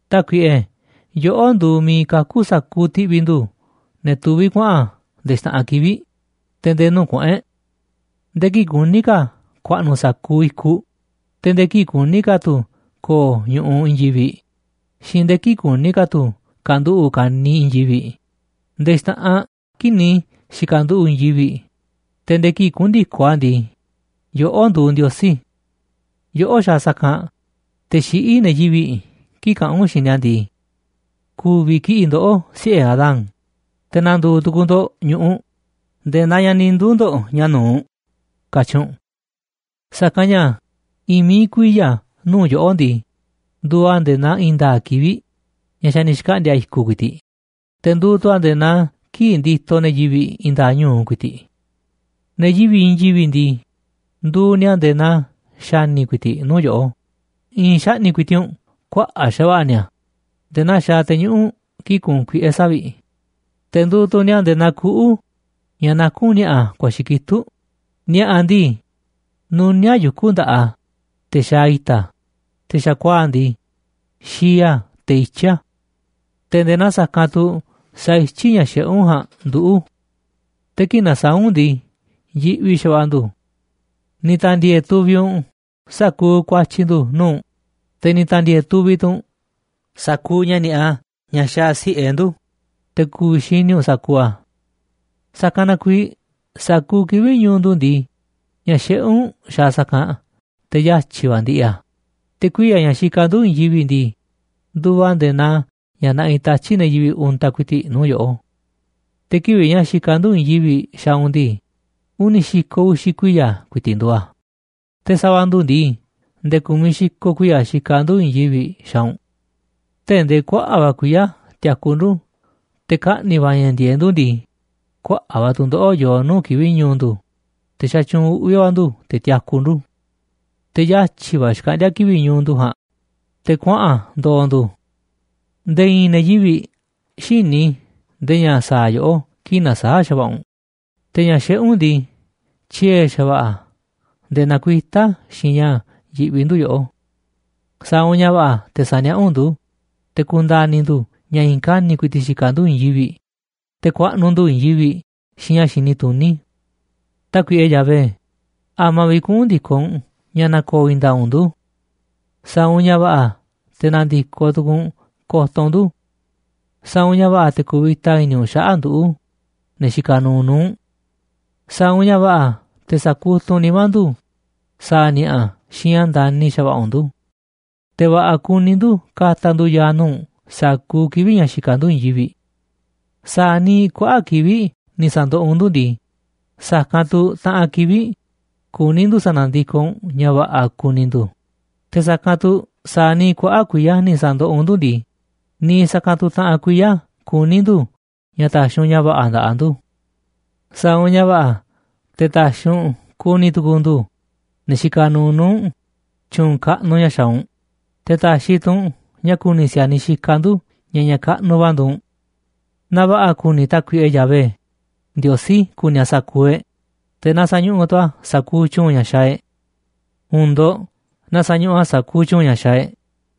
Tákuiꞌe, yoꞌó nduuꞌ miiꞌ kakú sa̱kuuꞌ ti̱ꞌvi̱ ndu̱ ne̱ tuví kuaꞌa̱n nde̱e̱ xta̱ꞌanꞌ kivi̱ꞌ, te̱ nde̱e̱ nuu̱ꞌ kuꞌu̱n e̱ꞌ. Nde̱e̱ kii̱ꞌ kuní ka̱ ku̱a̱ꞌnu̱ sa̱kuuꞌ i̱kuꞌ, te̱ nde̱e̱ kii̱ꞌ kuní ka̱ tu̱ ko̱o̱ ñu̱ꞌuꞌ i̱i̱n yivi̱ꞌ xiinꞌ nde̱e̱ kii̱ꞌ kuní ka̱ tu̱ ka̱nduꞌu̱ꞌ ka̱niiꞌ i̱i̱n yivi̱ꞌ, nde̱e̱ xta̱ꞌanꞌ kii̱ꞌ ni̱ xi̱ka̱nduꞌu̱ꞌ i̱i̱n yivi̱ꞌ, te̱ nde̱e̱ kii̱ꞌ kuꞌu̱n ndi̱koꞌ a̱ ndii, yoꞌó nduuꞌ Ndiosí. Yoꞌó xaaꞌ sa̱kanꞌ te̱ xiꞌí ne̱ yivi̱ꞌ kii̱ꞌ kaꞌán u̱nꞌ xiinꞌ ni̱a̱ ndii: “Ku̱vi̱ kiꞌi̱ꞌ ndoꞌó siꞌe̱ Adán, te̱ na̱ndu̱u̱ tu̱ku̱u̱ ndo̱ꞌ ñu̱ꞌuꞌ nde̱e̱ naa ña̱ ni̱ nduu̱ ndo̱ꞌ ña̱ nu̱uꞌ”, katyi̱ u̱nꞌ. Sa̱kanꞌ ña̱ i̱i̱n mií kuiya̱ nuu̱ꞌ yoꞌó ndii, nduuꞌ a̱ nde̱e̱ naa i̱i̱n nda̱a̱ꞌ kivi̱ꞌ ña̱ xa̱ ni̱ xkaꞌndi̱a̱ i̱ku̱ ku̱i̱ti̱ꞌ, te̱ nduuꞌ tu̱ a̱ nde̱e̱ naa kii̱ꞌ nditoꞌ ne̱ yivi̱ꞌ i̱i̱n nda̱a̱ꞌ ñu̱u ku̱i̱ti̱ꞌ. Ne̱ yivi̱ꞌ i̱i̱n yivi̱ꞌ ndii, nduuꞌ ni̱a̱ nde̱e̱ naa xa̱ni̱ ku̱i̱ti̱ꞌ nuu̱ꞌ yoꞌó, i̱i̱n xaꞌni̱ꞌ ku̱i̱ti̱ꞌ u̱nꞌ kuaꞌa̱ꞌ xa̱va̱ꞌa̱ ni̱a̱ nde̱e̱ naa xaaꞌ te̱ñuꞌu̱ꞌ kii̱ꞌ kuunꞌ kuiꞌe̱ savi̱ꞌ. Te̱ nduuꞌ tu̱ ni̱a̱ nde̱e̱ naa kuꞌu̱ ña̱ nakún ni̱a̱ꞌa̱ ku̱a̱xi̱ kitúꞌ. Ni̱a̱ꞌa̱ ndii, nuníáꞌ yuku̱ nda̱ꞌaꞌ a̱, te̱ xaaꞌ i̱ta̱ a̱, te̱ xa̱kuaa̱ꞌ ndii, xii a̱ te̱ ityí a̱. Te̱ nde̱e̱ naa sa̱kanꞌ tu̱ saityí ña̱ xiꞌé u̱nꞌ ja̱a̱nꞌ nduꞌu̱, te̱ kii̱ꞌ nasaáꞌ u̱nꞌ ndii, yiꞌvi xa̱va̱ꞌa̱ ndu̱. Ni̱ ta̱ndi̱e̱e̱ tuviꞌ u̱nꞌ sa̱kuuꞌ ku̱a̱tyi̱ ndu̱ nuu̱ꞌ u̱nꞌ, te̱ ni̱ ta̱ndi̱e̱e̱ tuviꞌ tu̱ u̱nꞌ sa̱kuuꞌ ña̱ ni̱a̱ꞌa ña̱ xaaꞌ si̱ꞌe ndu̱, te̱ ku̱vi̱ xini u̱nꞌ sa̱kuuꞌ a̱. Sa̱kanꞌ na kuiiꞌ sa̱kuuꞌ kivi̱ꞌ ñu̱u̱ ndu̱ ndii, ña̱ xiꞌé u̱nꞌ xaaꞌ sa̱kanꞌ, te̱ yatyi̱ va̱ ndiꞌiꞌ a̱, te̱ kuiya̱ ña̱ xikaꞌ ndu̱ i̱i̱n yivi̱ꞌ ndii, nduuꞌ a̱ nde̱e̱ naa ña̱ naꞌiꞌ tatyi̱ꞌ ne̱ yivi̱ꞌ untaꞌ ku̱i̱ti̱ꞌ nuu̱ꞌ yoꞌó. Te̱ kivi̱ꞌ ña̱ xikaꞌ ndu̱ i̱i̱n yivi̱ꞌ xaaꞌ u̱nꞌ ndii, uni̱ xi̱ko̱ uxi̱ kuiya̱ ku̱i̱ti̱ꞌ nduuꞌ a̱, te̱ sa̱va̱ ndu̱ ndii, nde̱e̱ ku̱miꞌ xi̱ko̱ kuiya̱ xikaꞌ ndu̱ i̱i̱n yivi̱ꞌ xaaꞌ u̱nꞌ. Tee̱ꞌ ndee kuaꞌa̱ꞌ va̱ kuiya̱ tiaku ndu̱ te̱ kaꞌni̱ va̱ ña̱ ndi̱e̱eꞌ ndu̱ ndii, kuaꞌa̱ꞌ va̱ tu̱ndoꞌo̱ꞌ yoo nuu̱ꞌ kivi̱ꞌ ñu̱u̱ ndu̱, te̱ xatyuunꞌ uꞌvi̱ va̱ ndu̱ te̱ tiaku ndu̱. Te̱ yatyi̱ va̱ xkaꞌndíá kivi̱ꞌ ñu̱u̱ ndu̱ ja̱a̱nꞌ, te̱ kuaꞌa̱n ndo̱o̱ ndu̱. Nde̱e̱ i̱i̱n ne̱ yivi̱ꞌ xïní ndee ña̱ sa̱a̱ yoꞌó kii̱ꞌ na̱saa̱ꞌ xa̱va̱ꞌa̱ u̱nꞌ. Te̱ ña̱ xiꞌé u̱nꞌ ndii, tyiee̱ xa̱va̱ꞌa̱ a̱ nde̱e̱ nakuitá a̱ xiinꞌ ña̱ yiꞌvi ndu̱ yoꞌó. Sa̱a̱ u̱nꞌ ña̱ va̱ꞌa̱ te̱ sa̱niaꞌá u̱nꞌ ndu̱ te̱ ku̱nda̱ni̱ ndu̱ ña̱ i̱i̱n kani̱ꞌ ku̱i̱ti̱ꞌ xikaꞌ ndu̱ i̱i̱n yivi̱ꞌ, te̱ ku̱a̱ꞌnu̱ ndu̱ i̱i̱n yivi̱ꞌ xiinꞌ ña̱ xini tuní. Tákuiꞌe Yahvé, ¿a̱ma̱ vi̱ꞌ kuꞌu̱n ndi̱koꞌ u̱nꞌ ña̱ na̱ko̱o̱ i̱i̱n nda̱a̱ꞌ u̱nꞌ ndu̱? Sa̱a̱ u̱nꞌ ña̱ va̱ꞌa̱ te̱ na̱ndi̱koꞌ tukuuꞌ u̱nꞌ ko̱to̱ u̱nꞌ ndu̱. Sa̱a̱ u̱nꞌ ña̱ va̱ꞌa̱ te̱ ku̱vi̱ta i̱ni̱ u̱nꞌ xaꞌa̱ꞌ nduꞌu̱, ne̱ xikaꞌ nuuꞌ nuu̱ꞌ u̱nꞌ. Sa̱a̱ u̱nꞌ ña̱ va̱ꞌa̱ te̱ sa̱kutuꞌ u̱nꞌ nimá ndu̱ sa̱a̱ ni̱a̱ꞌa̱ xiinꞌ ña̱ ndani̱ xa̱va̱ꞌa̱ u̱nꞌ ndu̱, te̱ va̱ꞌa̱ kuni ndu̱ ka̱ta̱ ndu̱ ya̱a̱ nuu̱ꞌ u̱nꞌ sa̱kuuꞌ kivi̱ꞌ ña̱ xikaꞌ ndu̱ i̱i̱n yivi̱ꞌ. Sa̱a̱ niiꞌ kuaꞌa̱ꞌ kivi̱ꞌ ni̱ sa̱ndoꞌoꞌ u̱nꞌ ndu̱ ndii, sa̱kanꞌ tu̱ taꞌanꞌ kivi̱ꞌ kuní ndu̱ sa̱na̱ndikoꞌ u̱nꞌ ña̱ va̱ꞌa̱ ku̱ni̱ ndu̱, te̱ sa̱kanꞌ tu̱ sa̱a̱ niiꞌ kuaꞌa̱ꞌ kuiya̱ ni̱ sa̱ndoꞌoꞌ u̱nꞌ ndu̱ ndii, niiꞌ sa̱kanꞌ tu̱ taꞌanꞌ kuiya̱ kuní ndu̱ ña̱ ta̱xi̱ u̱nꞌ ña̱ va̱ꞌa̱ nda̱ꞌaꞌ ndu̱. Sa̱a̱ u̱nꞌ ña̱ va̱ꞌa̱ te̱ ta̱xi̱ u̱nꞌ ku̱ni̱ tu̱ku̱u̱ ndu̱, ne̱ xikaꞌ nuuꞌ nuu̱ꞌ, tyu̱u̱n kaꞌnuꞌ ña̱ xaaꞌ u̱nꞌ, te̱ ta̱xi̱ tu̱ u̱nꞌ na ku̱ni̱ si̱a̱niꞌ xikaꞌ ndu̱ ña̱ ña̱ kaꞌnuꞌ va̱ nduuꞌ u̱nꞌ. Na va̱ꞌa̱ ku̱ni̱ Tákuiꞌe Yahvé Ndiosí ku̱ni̱ a̱ sa̱kuuꞌ e̱ꞌ, te̱ na sa̱ñuꞌuꞌ tu̱ a̱ sa̱kuuꞌ tyu̱u̱n ña̱ xaaꞌ e̱ꞌ. ¡U̱u̱n ndo̱ꞌ, na sa̱ñuꞌuꞌ a̱ sa̱kuuꞌ tyu̱u̱n ña̱ xaaꞌ e̱ꞌ!